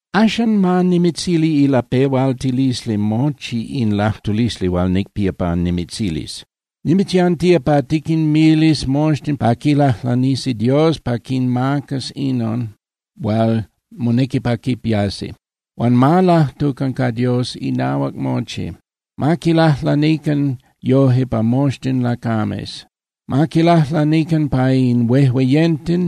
Axan, ma nimitzili ilapehualtilisli mochi in lajtulisli hual nicpía pa nimitzilis. Nimitzyantía pa tiquinmilis moxtin pa quilajlanisi Dios pa quinmacas inon hual monequi pa quipiasi. Huan ma lajtucan ca Dios inahuac mochi. Ma quilajlanican yoje pa moxtin lacames. Ma quilajlanican pa in huejueyenten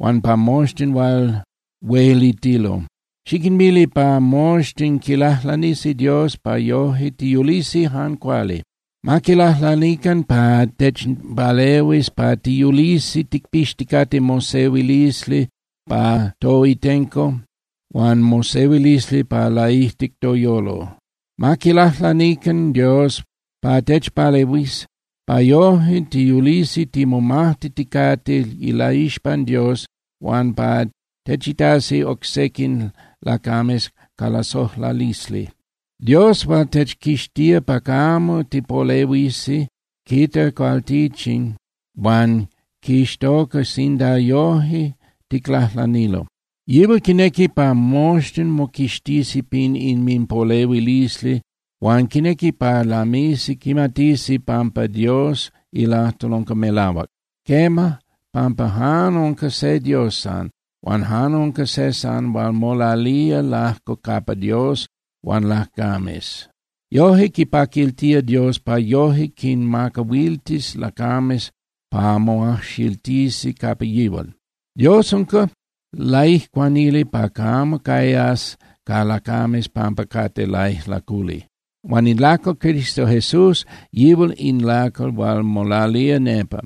huan pa moxtin hual huelitilo. Xiquinmili pa moxtin quilajlanisi Dios pa yoje tiyulisi jan cuali. Ma quilajlanican pa techpalehuis pa tiyulisi ticpixticate mosehuilisli pa toitenco huan mosehuilisli pa laijtic toyolo. Ma quilajlanican Dios pa techpalehuis pa yoje tiyulisi timomajtiticate ilaixpan Dios huan pa techitasi oc sequin lacames ca lasojlalisli. Dios hual techquixtía pa camo tipolehuisi quita cualtichin huan quixtoca sinda yoje ticlajlanilo. Yihual quinequi pa moxtin moquixtisi pin inminpolehuilisli huan quinequi pa lamisi quimatisi pampa Dios ilajtol unca melahuac. Quema, pampa jan unca se Dios san, huan jan unca se san hual molalía lajco capa Dios huan lacames. Yoje quipaquiltía Dios pa yoje quinmacahuiltis lacames pa moajxiltisi capa yihual. Dios unca laijcuanili pa camo cayas ca lacames pampa cate laijlaculi. Huan in lacal Cristo Jesús, yihual in lacal hual molalía nepa.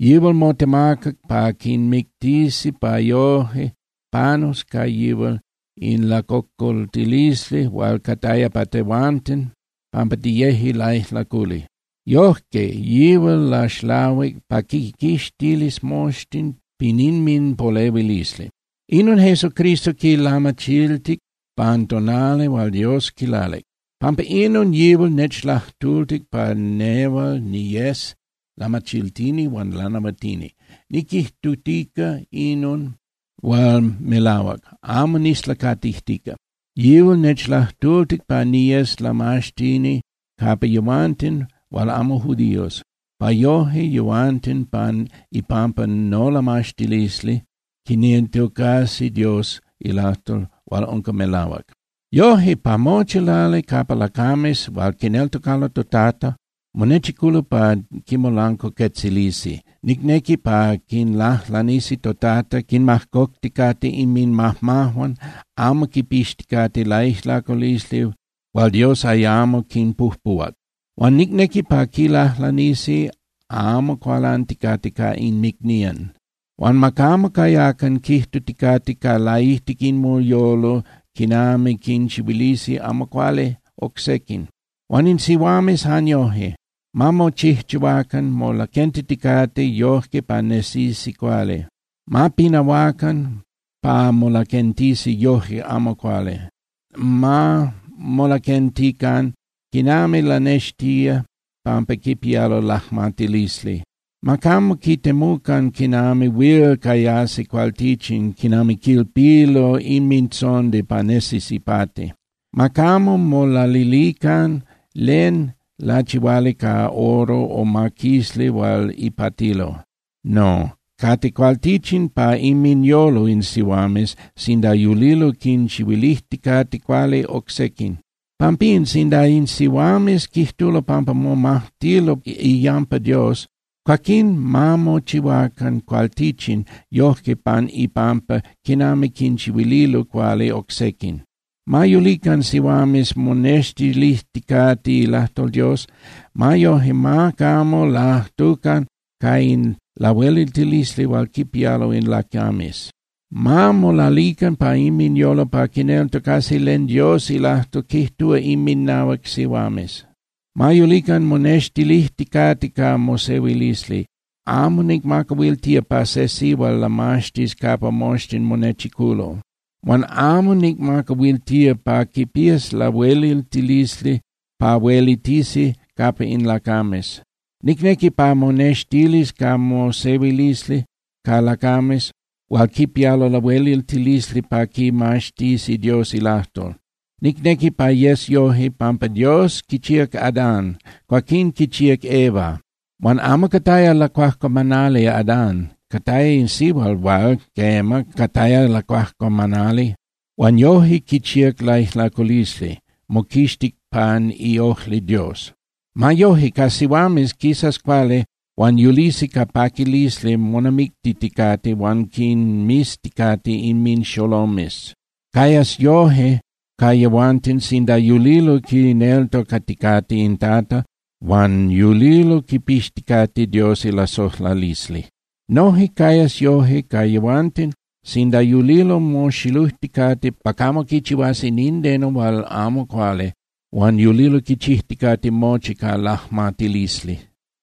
Yihual motemacac pa quimictisi pa yoje panus ca yihual in lacocoltilisli hual cataya pa tehuanten pampa tiyeje laijlaculi. Yojque yihual laxlahuic pa quiquixtilis moxtin pin inminpolehuilisli. Inon Jesucristo quilamachiltic pan tonali hual Dios quilalic. Pampa inon, yihual nechlajtultic pa nehual niyes lamachiltini huan lanahuatini. Niquijtutica inon hual melahuac, amo nislacatijtica. Yihual nechlajtultic pa niyes lamaxtini capa yehuanten hual amo judíos, pa yoje yehuanten pan ipampa nolamaxtilisli quineltocasi Dios ilajtol hual unca melahuac. Yoje, pa mochi lali capa lacames hual quineltocalo toTata monechiculo pa quimolancuacuetzilisi, nicnequi pa quilajlanisi toTata quinmajcocticate inminmajmajuan, amo quipixticate laijlaculisli hual Dios ayamo quinpujpuhuac. Huan nicnequi pa quilajlanisi amo cualanticate ca inmicnían. Huan ma camo cayacan quijtuticate ca laijtic inminyolo quinami quinchihuilisi amo cuali oc sequin. Huan in sihuames jan yoje, ma mochijchihuacan molaquentiticate yoje pa nesisi cuali. Ma pinahuacan pa molaquentisi yoje amo cuali, ma molaquentican quinami lanextía pampa quipialo lajmatilisli. Ma camo quitemucan quinami huil cayasi cualtichin quinami quilpilo inmintzondi pa nesis ipati. Ma camo molalilican len lachihuali ca oro o maquisli hual ipatilo. No, cate cualtichin pa inminyolo in sihuames sinda yulilo quinchihuilijticate cuali oc sequin. Pampín, sinda in sihuames quijtulo pampa momajtilo iyampa Dios, cuaquín ma mochihuacan cualtichin yoje pan ipampa quinami quinchihuililo cuali oc sequin. Ma yulican sihuames monextilijticate ilajtol Dios. Ma yoje, ma camo lajtucan ca in lahueliltilisli hual quipialo in lacames. Ma molalican pa inminyolo pa quineltocasi len Dios ilajtol quijtúa inminahuac sihuames. Ma yulican monextilijticate ca mosehuilisli. Amo nicmacahuiltía pa se sihual lamaxtis capa moxtin monechiculo, huan amo nicmacahuiltía pa quipías lahueliltilisli pa huelitisi capa in lacames. Nicnequi pa monextilis ca mosehuilisli ca lacames hual quipialo lahueliltilisli pa quimaxtisi Dios ilajtol. Nicnequi pa yes yoje, pampa Dios quichíac Adán, cuaquín quichíac Eva. Huan amo cataya lacuajcuamanali Adán. Cataya in sihual hual, quema, cataya lacuajcuamanali huan yoje quichíac laijlaculisli, moquixtic pan iojli Dios. Ma yoje, ca sihuames quisas cuali huan yulisi ca paquilisli monamictiticate huan quinmizticate inminxolomes. Cayas yoje ca yehuanten sinda yulilo quineltocaticate in Tata huan yulilo quipixticate Dios ilasojlalisli. Noje cayas yoje ca yehuanten sinda yulilo moxilujticate pa camo quichihuasi nindeno hual amo cuali huan yulilo quichijticate mochi ca lajmatilisli.